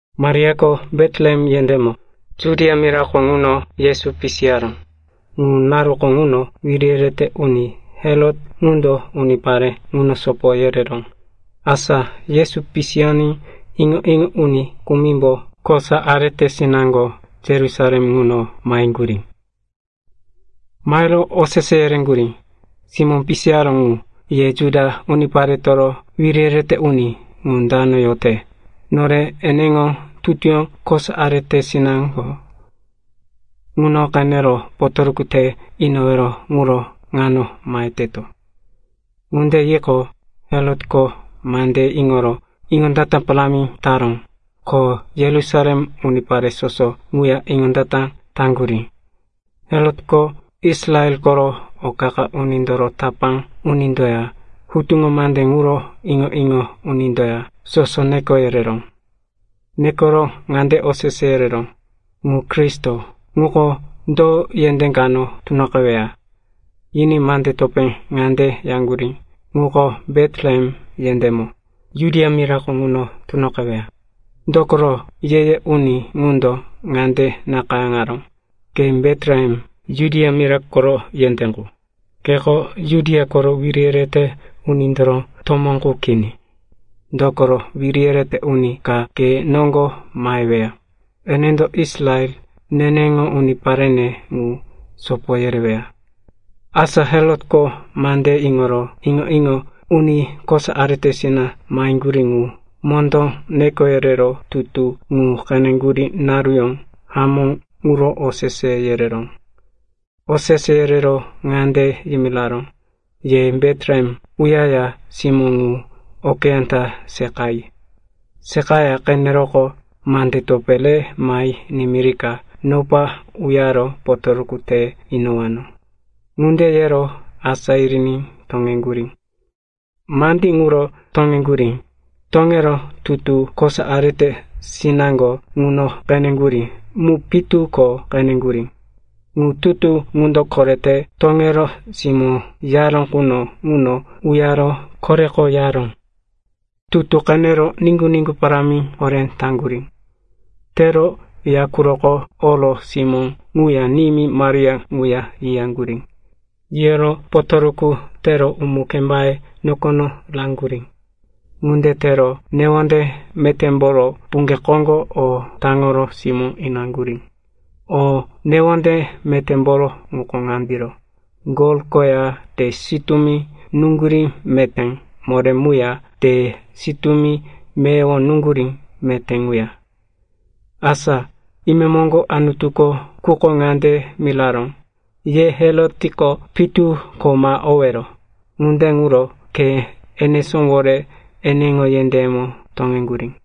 Mariako Betlehem yendémo, Judia mirako ŋuno, Yesu pisiyaró. Ŋu naruko ŋuno wiri yerete uni Herot ŋundo unipare ŋuno sopo yereró. Asa Yesu pisiyoní iŋo-iŋo uni kumimbo kosa aretesinaŋgo Yerusalem ŋuno maheŋgurí. Mahero osese yereŋgurí, “Simó pisiyaró ŋu, ye Juda uniparetoro wiri yerete uni, ŋu dano yote? Nore eneŋo tutuyó kosa aretesina ŋuno qenero potoruku te inowero quro ŋano maheteto.” Ŋunde yiqo, Herotko mandeye iŋoro iŋondata parámi taró. Ko Yerusalem unipare soso ŋuya iŋondata taŋgurí. Herotko Israel koro o qa-qa unindoro tapá unindoya hutuŋo mande ŋuro iŋo-iŋo unindoya soso neko yereró. Nekoro ŋande osese yereró, “Ŋu Kristo ŋuko, do yendé kano tunoqeweya?” Yiní mande topé ŋande yaŋgurí, “Ŋuko Betlehem yendémo, Judia mirako ŋuno, tunoqeweya. Dokoro ye-ye uni ŋundo ŋande nakayáŋaró, “‘Ke Betlehem, Judia mira koro yendé qu, keko Judia koro wiri yerete unindoro tomó qu kini. Dokoro wiri yerete uni ka ke noŋgo maheweya. Enendo Israel, neneŋo uniparene ŋu, sopo yereweya.’” Asa Herotko mandeye iŋoro iŋo-iŋo uni kosa aretesinaŋgo maheŋgurí ŋu mondó neko yerero tutu ŋu qeneŋgurí naruyó hamó ŋuro osese yereró. Osese yero ŋande yimiraró, “Ye Betlehem uyaya simó ŋu okeyá ta seqayi. Seqa qeneroqo, mande topé re mahe nimirika nopa uyaro potoruku te inowano.” Ŋunde yero asá yiriní toŋeŋgurí. Mandí iŋoro toŋeŋgurí. Toŋero tutu komo kosa aretesina ŋuno qeneŋgurí mu pitu ko qeneŋgurí. Ŋu tutu ŋundo korete toŋero simó yoraró quno ŋuno uyaro koreko yaró. Tutu qenero niŋgu-niŋgu parámi horé taŋgurí. Tero ya quroko oro simó ŋuya nimí Maria ŋuya yiyaŋgurí. Yiyoro potoruku tero umu-kembaye nokono raŋgurí. Ŋunde tero newonde metémboro puŋge koŋgo o taŋoro simó inaŋgurí. O newonde metémboro ŋuko ŋandiro: gol koya te sitúmi nuŋgurí meté moré muya te sitúmi meyowo nuŋgurí meté muya. Asa imemoŋgo Anutuko quko ŋande yimiraró, “Ye Herotko pitu ko ma owero.” Ŋunde ŋuro khe enesówore eneŋo yendéyemo toŋeŋgurí.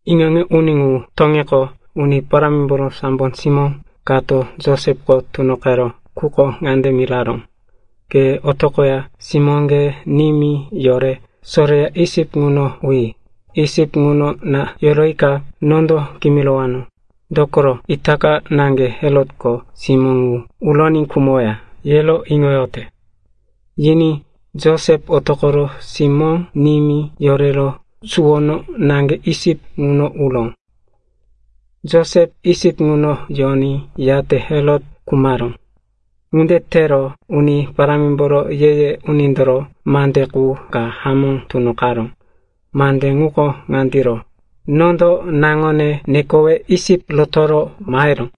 Iŋo-iŋo uni ŋu toŋiqo, Uni Parámimboro sambo simó kato Josepko tunoqero quko ŋande miraró, “Ke otoqoya simóŋge nimí yore soreya Isip ŋuno uyi. Isip ŋuno na yoroyika nondo kimirowano. Dokoro itaka naŋge Herotko simó ŋu uroní khumoweya, yero iŋoyote.” Yiní Josep otoqoro simó, nimí yorero suwono naŋge Isip ŋuno uró. Josep Isip ŋuno yoní, yate Herot khumaró. Ŋunde tero Uni Parámimboro ye-ye unindoro mande qu ka hamó tunoqaró. Mande ŋuko ŋandiro, “Nondo naŋone nekowe Isip rotoro maheró.”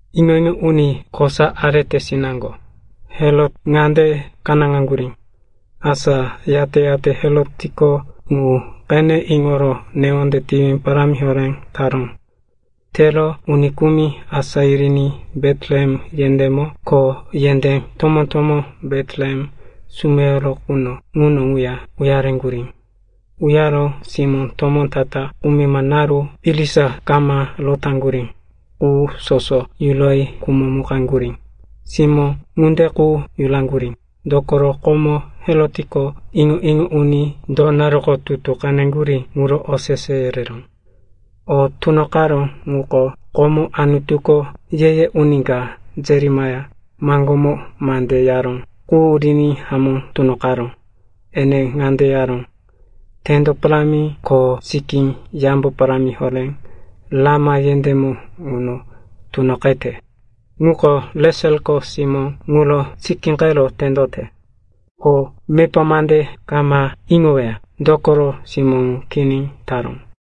Iŋo-iŋo uni kosa aretesinaŋgo ŋundo Herot ŋunde kanáŋaŋgurí. Asa yate-yate Herotko ŋu qene iŋoro newonde tiwi parámi horé taró. Tero uni kumi asá yiriní Betlehem yendémo ko yendé tomó-tomó Betlehem sumeyoro quno ŋuno ŋuya uyareŋgurí. Uyaro simó tomó ta-ta kumima naru irisa kama rotaŋgurí qu soso yuroyi khumomukaŋgurí. Simó ŋunde qu yuraŋgurí, dokoro komo Herotko iŋo-iŋo uni do naruko tutu qeneŋgurí ŋuro osese yereró. O tunoqaró ŋuko komo Anutuko ye-ye uni ka, Jeremaia, maŋgómo mande yaró qu riní hamó tunoqaró. Ene ŋande yaró, “Tendo parámi ko sikí yambo parámi horé Rama yendémo ŋuno tunoqete. Ŋuko Reseliko simó ŋuro sikíqero tendote. Ko mepa mande kama iŋoweya, dokoro simó ŋu kini taró.”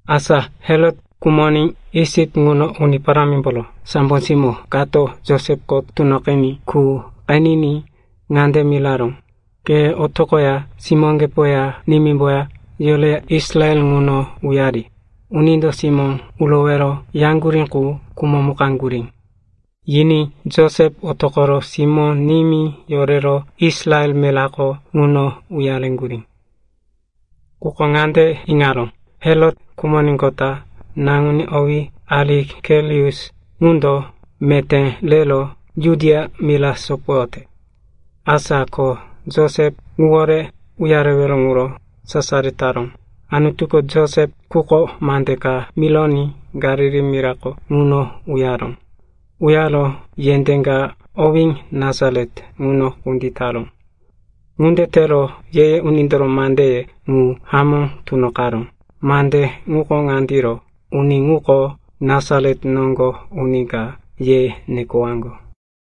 Asa Herot khumoní Isip ŋuno Uni Parámimboro sambo simó kato Josepko tunoqiní qu qeniní ŋande miraró, “Ke otoqoya simóŋgepoya nimímboya yoreya Israel ŋuno uyari. Unindo simó urowero yaŋgurí qu khumomukaŋgurí.” Yiní Josep otoqoro simó, nimí yorero Israel mirako ŋuno uyareŋgurí. Quko ŋande iŋaró, Herot khumoníqota naŋuní, owí Arikelaus, ŋundo meté rero Judia mira sopoyote. Asa ko Josep ŋuwore uyarewero ŋuro sasaro taró. Anutuko Josep quko mande ka mironí Galili mirako ŋuno uyaró. Uyaro yendé ka owí Nasaret ŋuno kunditaró. Ŋunde tero ye-ye unindoro mandeye ŋu hamó tunoqaró. Mande ŋuko ŋandiro, “Uni ŋuko, Nasaret noŋgo uni ka, ye nekowaŋgo.”